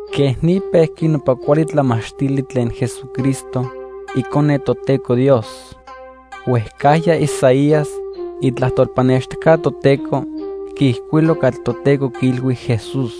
Quej ni pejqui nopa cuali tlamachtili tlen Jesucristo, Icone Toteco Dios. Huejcajya Isaías, itlajtol pannextijca Toteco, quiijcuilo catli Toteco quiilhui Jesús.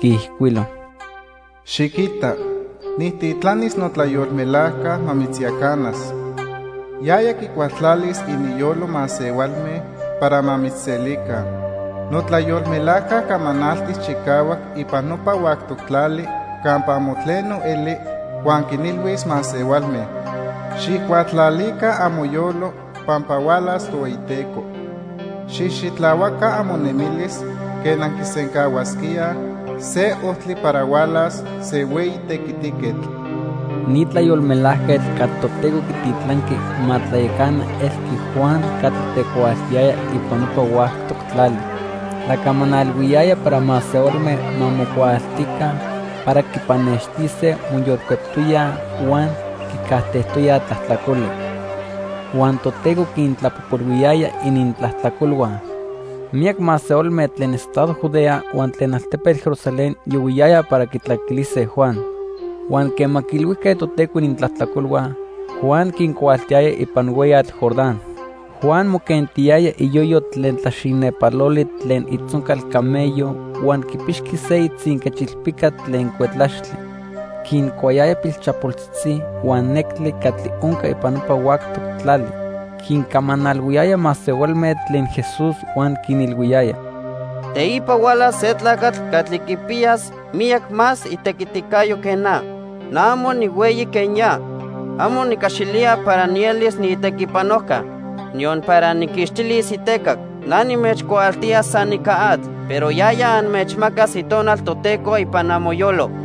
Quiijcuilo: "Xiquita nijtitlanis notlayolmelajca ma mitzyacanas. Yaya quicualtlalis ininyolo masehualme para ma mitzselica. Notlayolmelajca camanaltis chicahuac ipan nopa huactoc tlali campa amo tleno eli, huan quinilhuis masehualme: 'Xijcualtlalica amoyolo pampa hualas Tohueyiteco. Xijxitlahuaca amonemilis quen anquisencahuasquíaj se ojtli para hualas se hueyi tequitiquetl.' " Ni tlayolmelajquetl catli Toteco quititlanqui ma tlayacana elqui Juan catli tecuaaltiyaya ipan nopa huactoc tlali. Tlacamanalhuiyaya para masehualme ma mocuaaltica para quipannextise moyolcueptoyaj huan quicajtejtoyaj tlajtlacoli. Huan Toteco quintlapojpolhuiyaya inintlajtlacolhua. Miyac masehualme tlen estado Judea huan tlen altepetl Jerusalén yohuiyayaj para quitlacaquilise Juan. Huan quema quiilhuijque Toteco inintlajtlacolhua, Juan quincuaaltiyaya ipan hueyatl Jordán. Juan moquentiyaya iyoyo tlen tlaxinepaloli tlen itzoncal camello huan quipixqui se itzinquechilpica tlen cuetlaxtli. Quincuayaya pilchapoltzitzi huan nectli catli onca ipan nopa huactoc tlali. Quincamanalhuiyaya masehualme tlen Jesús huan quinilhuiyaya: "Teipa hualas se tlacatl catli quipiyas miyac más itequiticayo que na. Na amo nihueyi quen ya. Amo nicaxilía para nielis niitequipanojca, niyon para nijquixtilis itecac. Na nimechcuaaltía san ica atl, pero yaya anmechmacas Itonal Toteco ipan amoyolo."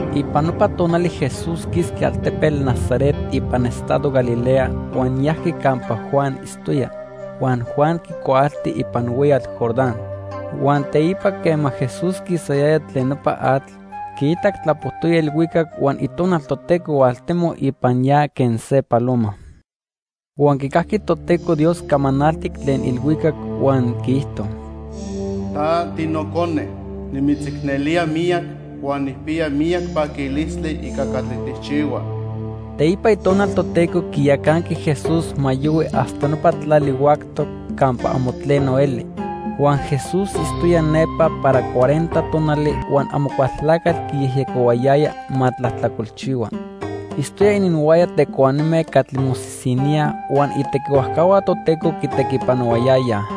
Ipan nopa tonali Jesús quisqui altepetl Nazaret ipan estado Galilea huan yajqui campa Juan itztoya, huan Juan quicuaalti ipan hueyatl Jordán. Huan teipa, quema Jesús quisayaya tlen nopa atl, quiitac tlapojtoya ilhuicac huan Itonal Toteco hualtemoc ipan ya quen se paloma. Huan quicajqui Toteco Dios camanaltic tlen ilhuicac huan quiijto: "Ta tiNocone, nimitzicnelía miyac huan nijpiya miyac paquilistli ica catli tijchihua." Teipa Itonal Toteco quiyacanqui Jesús ma yohui hasta nopa tlali huactoc campa amo tleno eli. Huan Jesús itztoya nepa para cuarenta tonali huan Amocualtlacatl quiyejyecohuayaya ma tlajtlacolchihua. Itztoya ininhuaya tecuanime catli mosisiníaj, huan itequihuajcahua Toteco quitequipanohuayayaj.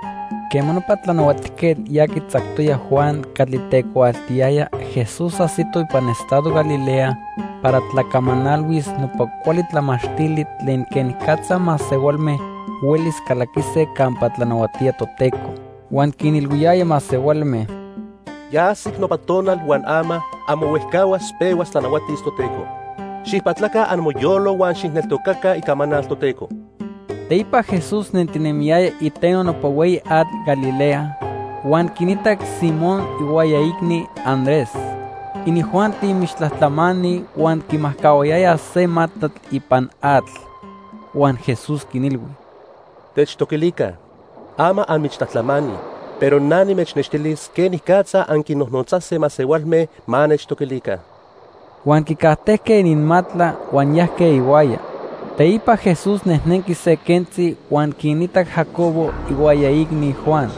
Quema nopa tlanahuatijquetl ya quitzactoya Juan catli tecuaaltiyaya, Jesús ajsito ipan estado Galilea para tlacamanalhuis nopa cuali tlamachtili tlen quenicatza masehualme huelis calaquise campa tlanahuatía Toteco. Huan quinilhuiyaya masehualme: "Ya ajsic nopa tonal huan ama, amo huejcahuas pehuas tlanahuatis Toteco. Xijpatlaca amoyolo huan xijneltocaca icamanal Toteco." Teipa Jesús nentinemiyaya iteno nopa hueyi atl Galilea huan quinitac Simón ihuaya iicni, Andrés. Inijuanti michtlajtlamani huan quimajcahuayayaj se matlatl ipan atl. Huan Jesús quinilhui: —Techtoquilica. Ama anmichtlajtlamani, pero na nimechnextilis quenicatza anquinnojnotzase masehualme ma nechtoquilica. Huan quicajtejque ininmatla huan yajque ihuaya. Teipa Jesús nejnenqui se quentzi huan quinitac Jacobo ihuaya iicni, Juan.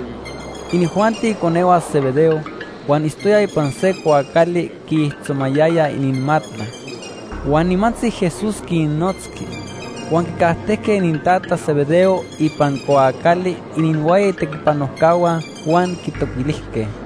Inijuanti iconehua Zebedeo, huan itztoyaj ipan se cuaacali quiijtzomayayaj ininmatla. Huan nimantzi Jesús quinnotzqui. Huan quicajtejque inintata Zebedeo ipan cuaacali ininhuaya itequipanojcahua huan quitoquilijque.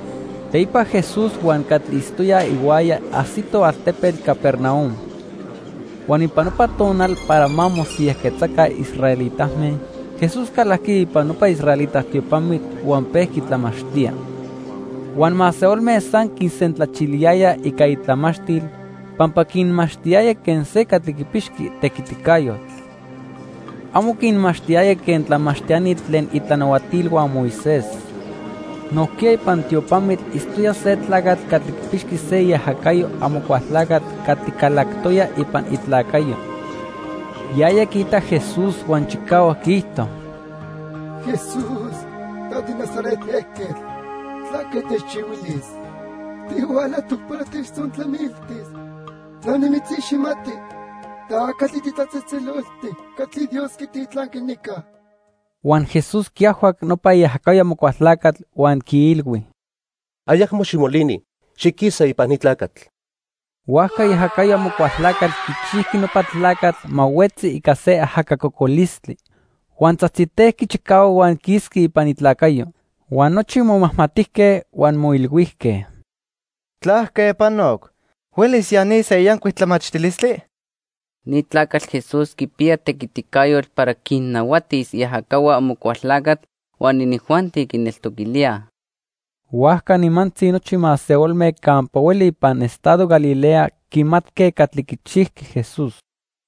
Teipa Jesús huan catli itztoyaj ihuaya ajsitoj altepetl Capernaum. Huan ipan nopa tonal para ma mosiyajquetzaca israelitame, Jesús calajqui ipan nopa israelita tiopamitl huan pejqui tlamachtía. Huan masehualme san quisentlachiliyayaj ica itlamachtil, pampa quinmachtiyaya quen se catli quipixqui tequiticayotl. Amo quinmachtiyaya quen tlamachtiani tlen itlanahuatilhua Moisés. Nojquiya ipan tiopamitl itztoya se tlacatl catli quipixqui se iajacayo Amocualtlacatl catli calactoya ipan itlacayo. Yaya quiitac Jesús huan chicahuac quiijto: —Jesús ta tiNazaret ejquetl, ¿tlaque techchihuilis? ¿Tihualajtoc para techtzontlamiltis? Na nimitziximati. Ta catli titlatzejtzeloltic catli Dios quititlanqui nica. Huan Jesús quiajhuac nopa iajacayo Amocualtlacatl huan quiilhui: —Ayacmo ximolini. Xiquisa ipan ni tlacatl. Huajca iajacayo Amocualtlacatl quichijqui nopa tlacatl ma huetzi ica se ajaca cocolistli. Huan tzajtzitejqui chicahuac huan quisqui ipan itlacayo. Huan nochi momajmatijque huan moilhuijque: —¿Tlaque panoc? ¿Huelis ya ni se yancuic tlamachtilistli? ¡Ni tlacatl Jesús quipiya tequiticayotl para quinnahuatis iajacahua Amocualtlacatl huan inijuanti quineltoquilíaj! Huajca nimantzi nochi masehualme campa hueli ipan estado Galilea quimatque catli quichijqui Jesús.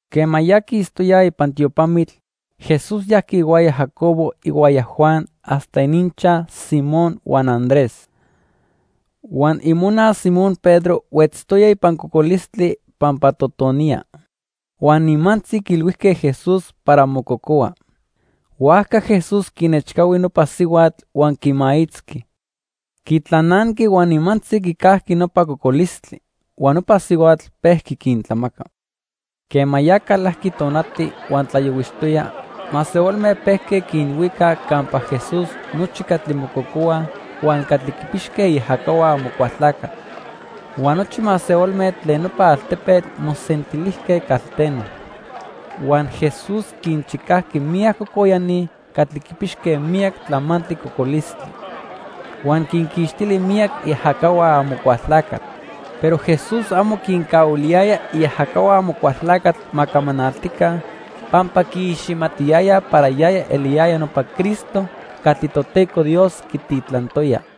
Quema ya quistoyaj ipan tiopamitl, Jesús yajqui ihuaya Jacobo ihuaya Juan hasta ininchaj Simón huan Andrés. Huan imona Simón Pedro huetztoya ipan cocolistli pampa totoniya. Huan nimantzi quiilhuijque Jesús para mococohua. Huajca Jesús quinechcahui nopa sihuatl huan quimaitzqui. Quitlananqui huan nimantzi quicajqui nopa cocolistli. Huan nopa sihuatl pejqui quintlamaca. Quema ya calajqui tonati huan tlayohuixtoya, masehualme pejque quinhuicaj campa Jesús nochi catli mococohuaj huan catli quipixque iajacahua Amocualtlacatl. Huan nochi masehualme tlen nopa altepetl mosentilijque calteno. Huan Jesús quinchicajqui miyac cocoyani catli quipixque miyac tlamantli cocolistli. Huan quinquixtili miyac iajacahua Amocualtlacatl. Pero Jesús amo quincahuiliyaya iajacahua Amocualtlacatl ma camanaltica, pampa quiiximatiyayaj para yaya eliyaya nopa Cristo catli Toteco Dios quititlantoya.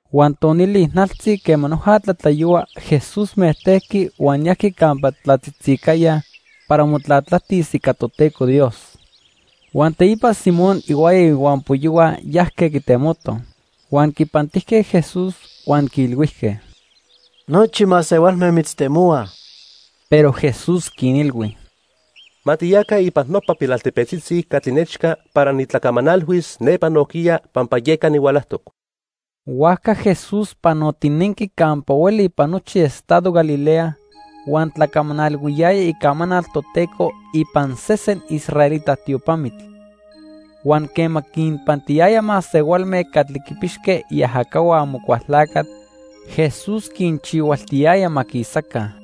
Huan tonili ijnaltzi quema noja tlatlayohua, Jesús mejtejqui huan yajqui campa tlatzitzicaya para motlatlajtis ica Toteco Dios. Huan teipa Simón ihuaya ihuampoyohua yajque quitemotoj. Huan quipantijque Jesús, huan quiilhuijque: —Nochi masehualme mitztemohuaj. Pero Jesús quinilhui: —Ma tiyaca ipan nopa pilaltepetzitzi catli nechca para nitlacamanalhuis nepa nojquiya pampa yeca nihualajtoc. Huajca Jesús panotinenqui campa hueli ipan nochi estado Galilea huan tlacamanalhuiyaya icamanal Toteco ipan sesen israelita tiopamitl. Huan quema quinpantiyaya masehualme catli quipixque iajacahua Amocualtlacatl, Jesús quinchihualtiyaya ma quisaca.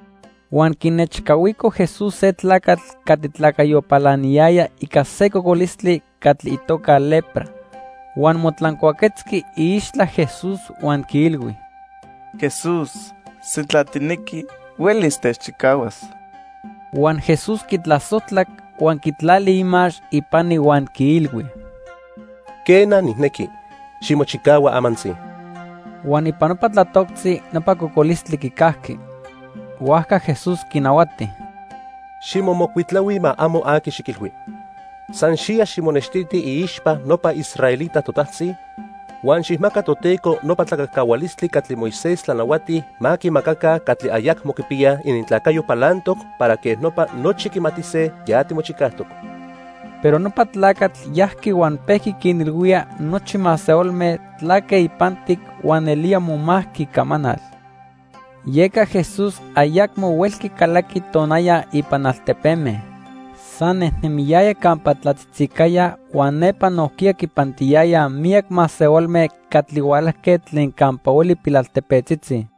Huan quinechcahuico Jesús se tlacatl catli tlacayo palaniyaya ica se cocolistli catli itoca lepra. Huan motlancuaquetzqui iixtla Jesús huan quiilhui: —Jesús, sintla tijnequi, huelis techchicahuas. Huan Jesús quitlasojtlac, huan quitlali imax ipani huan quiilhui: —Quena, nijnequi. Ximochicahua amantzi. Huan ipan nopa tlatoctzi nopa cocolistli quicajqui. Huajca Jesús quinahuati: —Ximomocuitlahui ma amo aqui xiquilhui. San xiya ximonextiti iixpa nopa israelita totajtzi, huan xijmaca Toteco nopa tlacajcahualistli catli Moisés tlanahuati ma quimacaca catli ayacmo quipiyaj inintlacayo palantoc para quej nopa nochi quimatise ya timochicajtoc. Pero nopa tlacatl yajqui huan pejqui quinilhuía nochi masehualme tlaque ipantic huan nelía momajqui icamanal. Yeca Jesús ayacmo huelqui calaqui tonaya ipan altepeme. San nejnemiyaya campa tlatzitzicaya huan nepa nojquiya quipantiyayaj miyac masehualme catli hualajque tlen campa hueli pilaltepetzitzi.